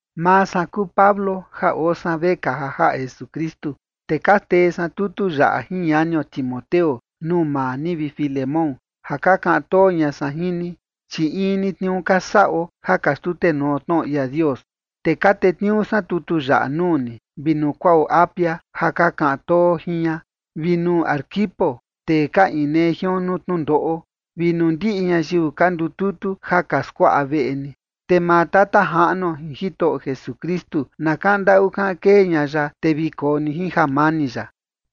Maa san kuu Pablo ja oo san vekaa ja jaꞌa Jesukristu, te ka tee san tutu yaꞌa jin ñanio Timoteo nuu maa ni, vi Filemón, ja ka kaꞌan too ña san jin ni, chi in ni tniuu ka saꞌo ja ka xtutenuo tnoꞌo ia Dios. Te ka tetniuu san tutu yaꞌa nuu ni, vi nuu kuaꞌo Apia ja ka kaꞌan too jin ña, vi nuu Arquipo, tee ka inee jion nuu tnundoꞌo, vi nuu ndiꞌi ñayiu ka ndututu ja ka skuaꞌa veꞌe ni. Te maa Tata Jaꞌnuo jin Jitoꞌo Jesukristu na kaꞌan ndaꞌu kaꞌan kee ña ya, te vi koo ni jin jamani ya.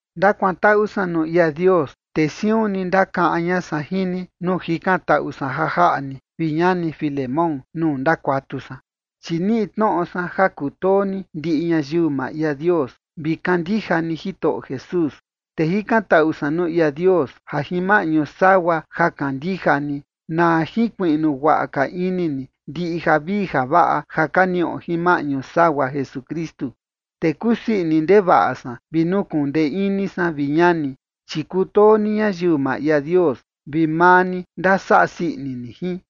Ndakuantaꞌu san nuu ia Dios, te siun ni ndakaꞌan ña san jin ni nuu jikantaꞌu san ja jaꞌa ni, vi ñani Filemón, nuu ndakuatu san. Chi niꞌi tnoꞌo san ja kutoo ni ndiꞌi ñayiu maa ia Dios vi kandija ni Jitoꞌo Jesús. Te jikantaꞌu san nuu ia Dios, ja jin maꞌñu sagua ja kandija ni na jinkuiꞌnu guaꞌa ka ini ni ndiꞌi javii javaꞌa ja ka niꞌo jin maꞌñu sagua Jesukristu. Te kusii ini ndevaꞌa san vi nukuꞌun ndee ini san, vi ñani, chi kutoo ni ñayiu maa ia Dios, vi maa ni ndasaꞌa sii ini ni jin.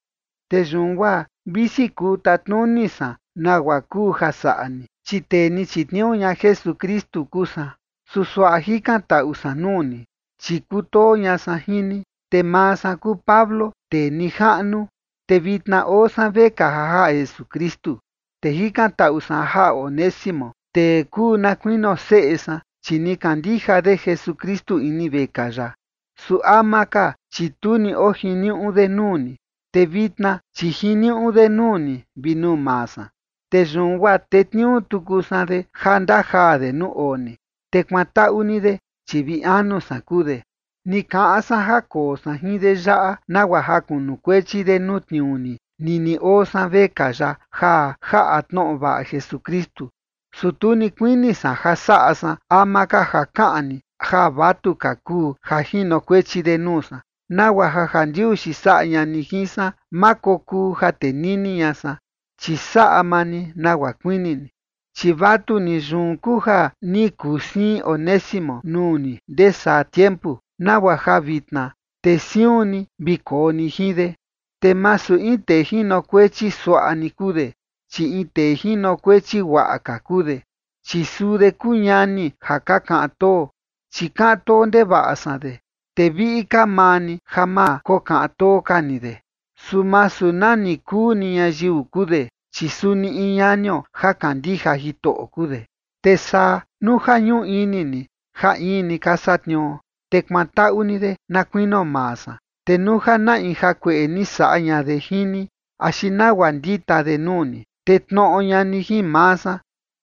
Te yun guaa visi kuu tatnuni san nagua kuu ja saꞌa ni, chi tee ni chitniuu ña Jesukristu kuu san, su suaꞌa jikantaꞌu san nuu ni, chi kutoo ña san jin ni. Te maa san kuu Pablo, tee nijaꞌnu, te vitna oo san vekaa ja jaꞌa Jesukristu. Te jikantaꞌu san ja jaꞌa Onésimo, tee kuu na kuinio seꞌe san, chi ni kandija de Jesukristu ini vekaa yaꞌa. Su ama ka, chi tu ni oo jiniuꞌu de nuu ni, te vitna, chi jiniuꞌu de nuu ni vi nuu maa san. Te yun guaa tetniuu tuku san de ja ndajaa de nuu oo ni, te kuantaꞌu ni de, chi vi anu san kuu de. Ni kaꞌan san ja koo san jin de yaꞌa nagua ja kunukuechi de nuu tniuu ni nini oo san vekaa yaꞌa ja jaꞌa tnoꞌo vaꞌa Jesukristu. Su tu ni kuini san ja saꞌa san ama ka ja kaꞌan ni ja vatuka kuu ja jinokuechi de nuu san, nagua ja jandiuxi saꞌa ña ni jin san ma kokuu ja tenini ña san, chi saꞌa maa ni nagua kuini ni. Chi vatuni, yun kuu ja ni kuu siin Onésimo nuu ni ndesaa tiempu, nagua ja vitna te siun ni vi koo ni jin de. Te masu in tee jinokuechi suaꞌa ni kuu de, chi in tee jinokuechi guaꞌa ka kuu de, chi suu de kuu ñani ja ka kaꞌan too, chi kaꞌan too ndevaꞌa san de, te viꞌi ka maa ni ja ma kokaꞌan too ka ni de, su masu nani kuu ni ñayiu kuu de, chi suni in ñanio ja kandija Jitoꞌo kuu de. Te saa, nuu ja ñuꞌu ini ni ja in ni ka satniuo, te kuantaꞌu ni de na kuinio maa san. Te nuu ja na in jakueꞌe ni saꞌa ña de jin ni axi nagua ndita de nuu ni, te tnoꞌo ña ni jin maa san.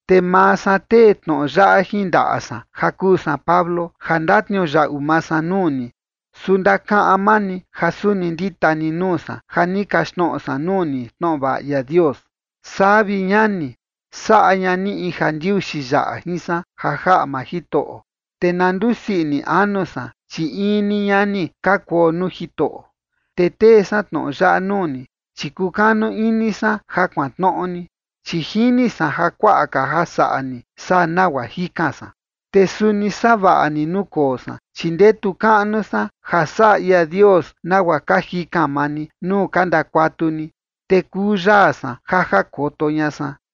Te maa san tee tnoꞌo yaꞌa jin ndaꞌa san ja kuu san Pablo, ja ndatniuyaꞌu maa san nuu ni, su ndakaꞌan maa ni ja suni ndita ni nuu san ja ni kaxtnoꞌo san nuu ni tnoꞌo vaꞌa ia Dios. Saa, vi ñani, saꞌa ña ni in jandiuxi yaꞌa jin san ja jaꞌa maa Jitoꞌo, te na ndusii ini anu san, chi in ni ñani ka kuo nuu Jitoꞌo. Te tee san tnoꞌo yaꞌa nuu ni, chi kukanu ini san ja kuantnoꞌo ni, chi jini san ja kuaꞌa ka ja saꞌa ni saa nagua jikan san. Te suni savaꞌa ni nuu koo san, chi ndetu kaꞌnu san ja saꞌa ia Dios nagua ka jikan maa ni nuu ka ndakuatu ni, te kuu yaa san ja jakoto ña san.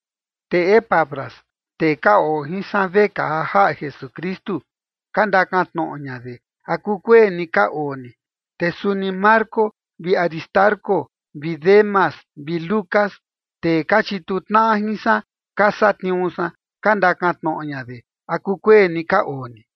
Te Epafras, tee ka oo jin san vekaa ja jaꞌa Jesukristu, ka ndakan tnoꞌo ña de, ¿a kuu kueni ka oo ni? Te suni Marcos vi Aristarco vi Demas vi Lucas, tee ka chituu tnaꞌa jin san ka satniuu san, ka ndakan tnoꞌo ña de, ¿a kukueni ka oo ni?